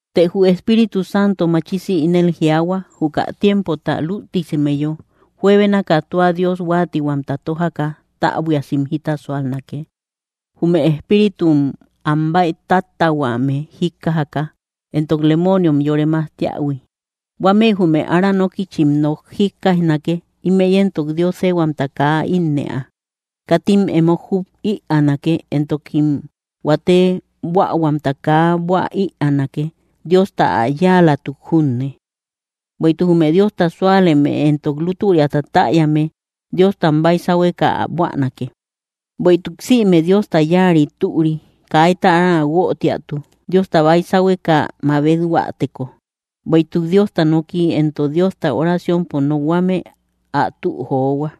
Të jü Espíritu Santo machisi ínel jiaahua: juka tiempota lütisimeyo, juebénaka tua Dios huáatihuamta tójaka täbuiasim jita súalnake, jume espíritum am bäitáttähuame jíkkajaka, entok lemooniom yore majtiähui. Huámëi jume ára nókïchim nok jíkkaijnake; ímëi éntok Dios éehuamta kaa ínnëa. Katim emo jub ïaanake, entokim huate buähuamta kaa buä ïaanake, Diosta ä yáalatuk junne. Bueïtuk jume Diosta súaleme entok lútüriata täyame, Diostam baisahueka ä buänake. Büeituk sïme Diosta yáari türi; kaita ára guötiatu, Diosta baysahueka mabethuäteko, bueïtuk Diosta noki entok Diostau oraciompo nokhuame ä tü johua.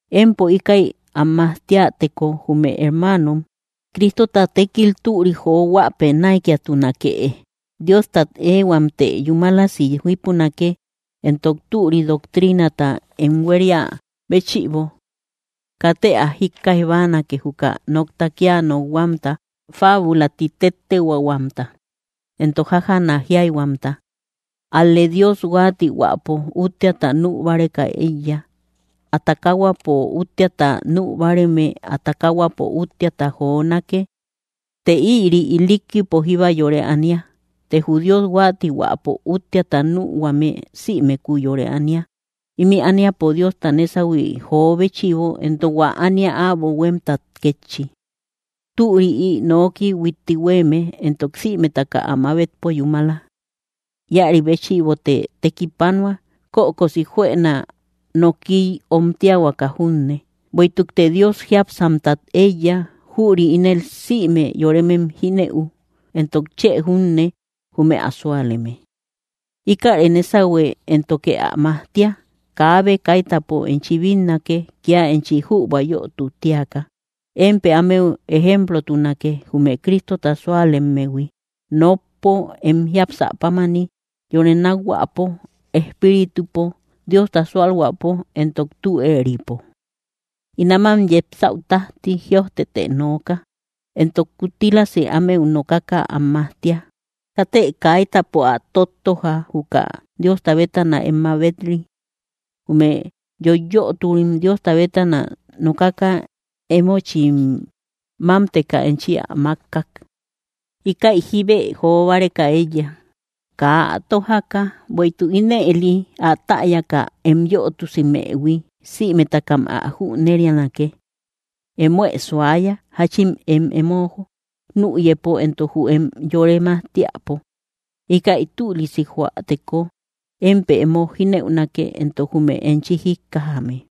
Empo íkäi am majtiäteko jume hermaanom, Cristota tékil türik johuäpë näikiatunakëe. Diostat éehuamtë yúmalasi jípunake, entok türi doctriinata em huéria béchïbo. Katë ä jíkkaij báanake, juka nokta kía nokhuamta fábula ti tettehuaahuamta, entok jájaana jíayhuamta; ál‑lë Dios huáatihuäpo úttiata nü báreka éiya. Ä takahuapo úttiata nü báareme, ä takahuapo úttiata jonake; të ïri ilikkipo jíba yore ania. Të jü Dios huáatihuäpo úttiata nühuame sïmeku yore ania, ímï ániapo Diosta nésahui jo béchïbo, entok hua ánia äbo huémtat kétchi. Türi ï nooki huitti huéeme, entok sïmetaka ä mabetpo yúmala. Íäri béchïbote tekipanua, kökosi juëna nokiy omtiahuaka junne, bueïtukte Dios jiápsamtat éiya. Jüri ínel sïme yoremem jínëu, entok chë junne, jume ä súaleme. Íkäre nésahue éntoke ä majtia. Kaabe kaitäpo enchi bínnake, kía enchi jübua yötu tíaka. Émpë ámeu ejemplotunake, jume Cristota suálemmehui, nokpo, em jiapsä pámani, yore nákhuäpo, espíritupo, Diosta súalhuäpo, entok tü éeripo. In áman yepsäu tájti, jïojtetë nooka, entok kuttilasë ámeu nokaka am majtia. Katë kaitäpo ä tóttoja, juka Diosta bétana em mabet‑ri. Jume yoiyöturim Diosta bétana nokaka, emochim mámteka enchi ä mákkak. Íkäi jíbe jo báreka éiya, kaa ä tójaka. Bueïtuk ínëli ä täyaka em yötusimëhui, sïmetakam ä jünerianake. Emoë suaya, jáchin em emo nüyëpo, entok jü em yore majtiäpo. Íkäi tülisi joäteko, émpë emo jínëunake, entok jume enchi jíkkajame.